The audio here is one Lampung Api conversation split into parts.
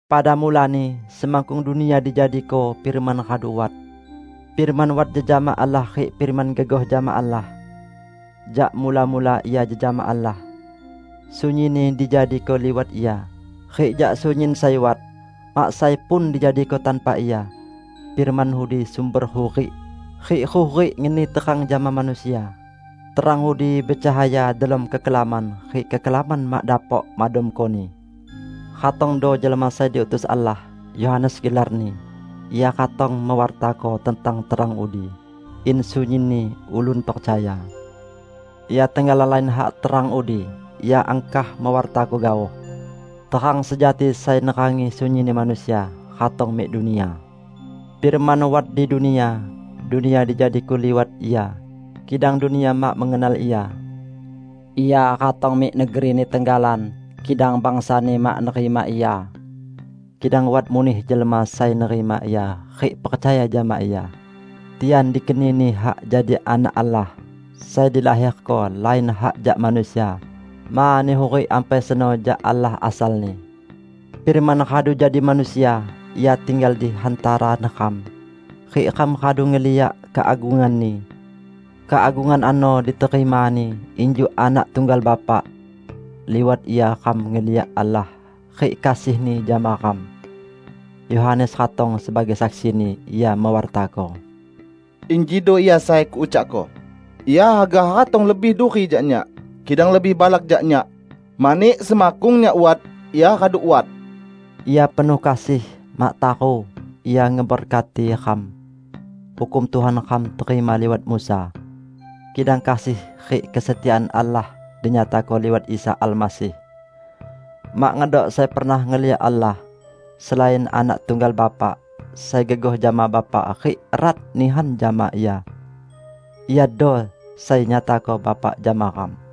Pada mulani, semakkung dunia dijadiko, Firman radu wat. Firman wat jejama Allah rik Firman gegoh jama Allah. Jak mula-mula Ia jejama Allah. Sunyinni dijadiko liwat Ia, rik jak sunyin sai wat, mak sai pun dijadiko tanpa Ia. Firman udi sumber hurik, rik hurik ngeni terang jama manusia. Terang udi becahaya delom kekelaman, rik kekelaman mak dapok madamkoni. Ratongdo jelma sai diutus Allah, Yohanes gelarni. Ia ratong mewartako tentang terang udi, in sunyinni ulun percaya. Ia tenggalan lain hak terang udi, ia angkah mewartako gaoh. Terang sejati sai nerangi sunyinni manusia, ratong mik dunia. Firman wat di dunia, dunia dijadiko liwat Ia, kidang dunia mak mengenal Ia. Ia ratong mik negeri-Ni tenggalan kidang bangsa-Ni mak nerima Ia. Kidang wat muneh jelma sai nerima Ia rik percaya jama Ia; tian dikeni-Ni hak jadi Anak Allah, sai dilaherko lain hak jak manusia, mani hurik ampai seno jak Allah asalni. Firman radu jadi manusia, Ia tinggal di hantara neram, rik ram radu ngeliak keagungan-Ni. Keagungan ano diterima-Ni injuk Anak tunggal Bapa. Liwat Ia ram ngeliak Allah rik kasih-Ni jama ram. Yohanes ratong sebagai saksi-Ni, ia mewartako: "Injido Ia sai kuucakko: Ia haga ratong lebih duri jak nyak, kidang lebih balak jak nyak, mani semakkung nyak wat, Ia radu wat." Ia penuh kasih; mak taru, Ia ngeberkati ram. Hukum Tuhan ram terima liwat Musa. Kidang kasih rik kesetiaan Allah dinyatako liwat Isa Almasih. Mak ngedok sai pernah ngeliak Allah, selain Anak tunggal Bapa, sai gegoh jama Bapa rik erat nihan jama Ia. Iado sai nyatako Bapa jama ram.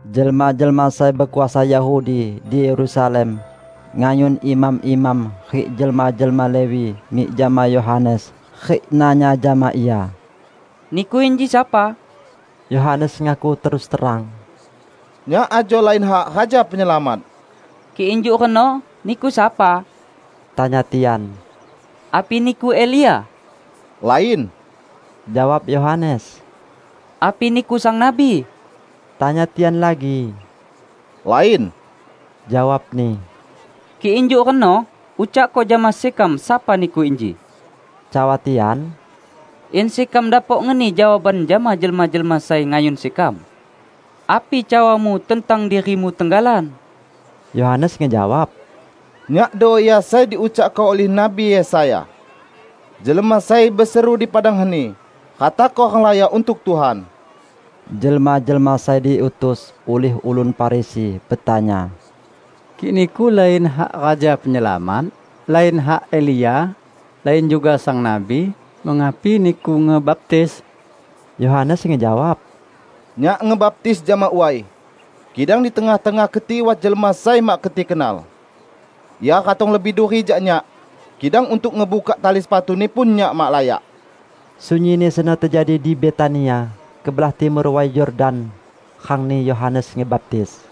Jelma-jelma sai bekuasa Yahudi di Yerusalem ngayun imam-imam rik jelma-jelma Lewi mik jama Yohanes rik nanya jama ia, "Niku inji sapa?" Yohanes ngaku terus terang, "Nyak ajo lain hak Raja Penyelamat." "Kik injuk reno, niku sapa?" tanya tian. "Api niku Elia?". "Lain," jawab Yohanes. "Api niku Sang Nabi?" tanya tian lagi. "Lain," jawabni. "Kik injuk reno, ucakko jama sekam sapa niku inji," cawa tian, "in sekam dapok ngeni jawaban jama jelma-jelma sai ngayun sekam. Api cawamu tentang dirimu tenggalan?" Yohanes ngejawab, "Nyakdo ia sai diucakko ulih Nabi Yesaya: 'Jelma sai beseru di padang heni: Ratako renglaya untuk Tuhan.' " Jelma-jelma sai diutus ulih ulun Farisi betanya, "Kik niku lain hak Raja Penyelamat, lain hak Elia, lain juga Sang Nabi, mengapi niku ngebaptis?" Yohanes ngejawab, "Nyak ngebaptis jama way. Kidang di tengah-tengah keti wat jelma sai mak keti kenal. Ia ratong lebih duri jak nyak, kidang untuk ngebukak tali sepatu-Ni pun nyak mak layak." Sunyinni seno tejadi di Betania, kebelah timur Way Yordan rangni Yohanes ngebaptis.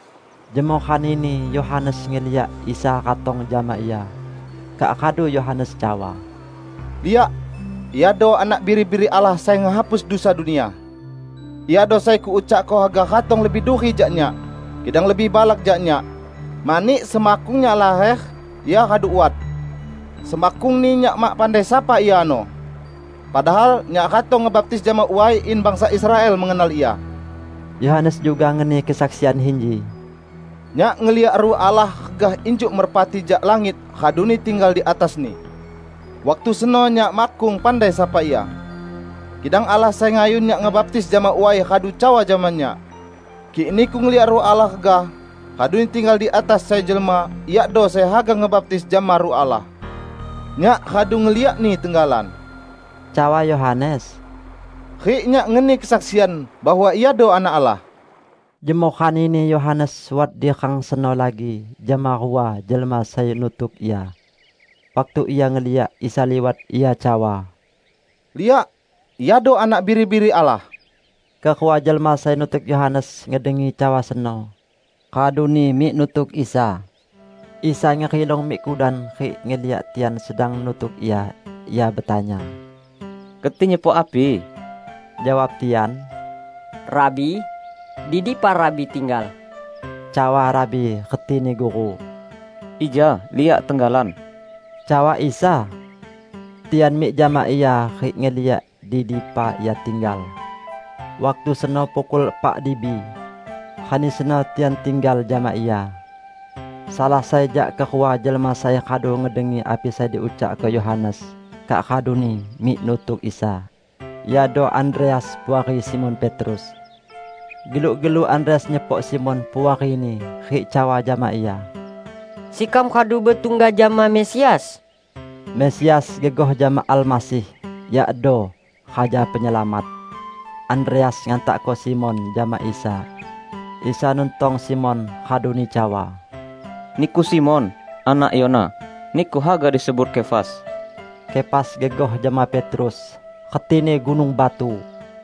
Jemoh ranini, Yohanes ngeliak Isa ratong jama ia. Kak radu Yohanes cawa, "Liak, Iado Anak Biri-biri Allah sai ngehapus dusa dunia. Iado sai kuucakko haga ratong lebih duri jak nyak, kidang lebih balak jak nyak, mani semakkung nyak laher, Ia radu wat. Semakkungni, nyak mak pandai sapa Ia ano. Padahal nyak ratong ngebaptis jama way in bangsa Israel mengenal Ia." Yohanes juga ngeni kesaksian inji, "Nyak ngeliak Ruh Allah regah injuk merpati jak langit raduni tinggal di atas-Ni. Waktu seno nyak makkung pandai sapa Ia. Kidang Allah sai ngayun nyak ngebaptis jama way radu cawa jama nyak, 'Kik niku ngeliak Ruh Allah regah, raduni tinggal di atas sai jelma, Iado sai haga ngebaptis jama Ruh Allah.' Nyak radu ngeliak-Ni tenggalan," cawa Yohanes, "rik nyak ngeni kesaksian bahwa Iado Anak Allah." Jemoh ranini Yohanes wat di rang seno lagi jama rua jelma sai nutuk ia. Waktu ia ngeliak Isa liwat, ia cawa, "Liak! Iado Anak Biri-biri Allah." Kerua jelma sai nutuk Yohanes ngedengi cawa seno, raduni mik nutuk Isa. Isa ngerilong mik kudan, rik ngeliak tian sedang nutuk Ia. Ia betanya, "Keti nyepok api?" Jawab tian, "Rabi, di dipa Rabi tinggal?" (Cawa 'Rabi' retini guru). "Ija liak tenggalan," cawa Isa. Tian mik jama Ia rik ngeliak di dipa ia tinggal. Waktu seno pukul epak dibi. Rani seno tian tinggal jama Ia. Salah sai jak kerua jelma sai radu ngedengi api sai diucakko Yohanes kak raduni mik nutuk Isa, iado Andreas, puari Simon Petrus. Geluk-geluk Andreas nyepok Simon, puarini, rik cawa jama ia, "Sekam radu betungga jama Mesias!" (Mesias gegoh jama Almasih, yakdo: Raja Penyelamat.) Andreas ngantakko Simon jama Isa. Isa nuntong Simon, raduni cawa, "Niku Simon, anak Yona. Niku haga disebut Kefas." (Kefas gegoh jama Petrus, retini: gunung batu.)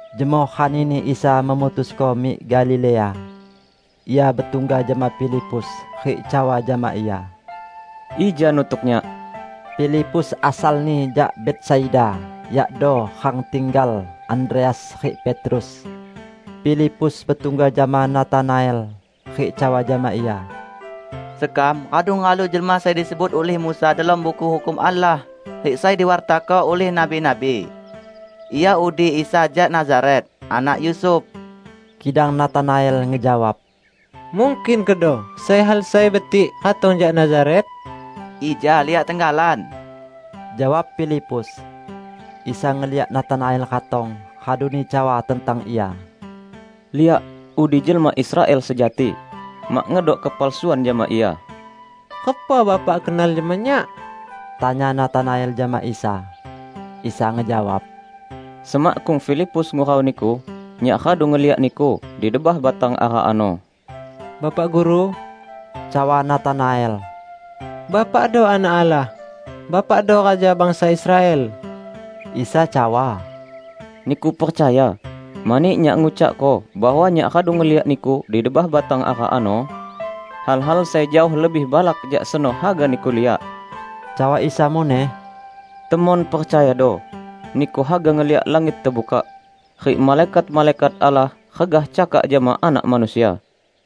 Jemoh ranini Isa memutusko mik Galilea. Ia betungga jama Filipus, rik cawa jama ia, "Ija nutuk Nyak!" Filipus asalni jak Betsaida, yakdo rang tinggal Andreas rik Petrus. Filipus betungga jama Natanael rik cawa jama ia, "Sekam radu ngehalu jelma sai disebut ulih Musa delom Buku Hukum Allah, rik sai diwartako ulih nabi-nabi. Ia udi Isa jak Nazaret, anak Yusuf." Kidang Natanael ngejawab, "Mungkin kedo sai hal sai betik ratong jak Nazaret?" "Ija liak tenggalan," jawab Filipus. Isa ngeliak Natanael ratong, raduni cawa tentang ia, "Liak, udi jelma Israel sejati. Mak ngedok kepalsuan jama ia." "Repa Bapak kenal jama nyak?" tanya Natanael jama Isa. Isa ngejawab, "Semakkung Filipus ngurau niku, Nyak radu ngeliak niku di debah batang ara ano." "Bapak Guru," cawa Natanael, "Bapakdo Anak Allah! Bapakdo Raja bangsa Israel!" Isa cawa, "Niku percaya, mani Nyak ngucakko bahwa Nyak radu ngeliak niku di debah batang ara ano? Hal-hal sai jaoh lebih balak jak seno haga niku liak!" Cawa Isa muneh, "Temon percayado, niku haga ngeliak langit tebukak, rik malaikat-malaikat Allah regah cakak jama Anak Manusia."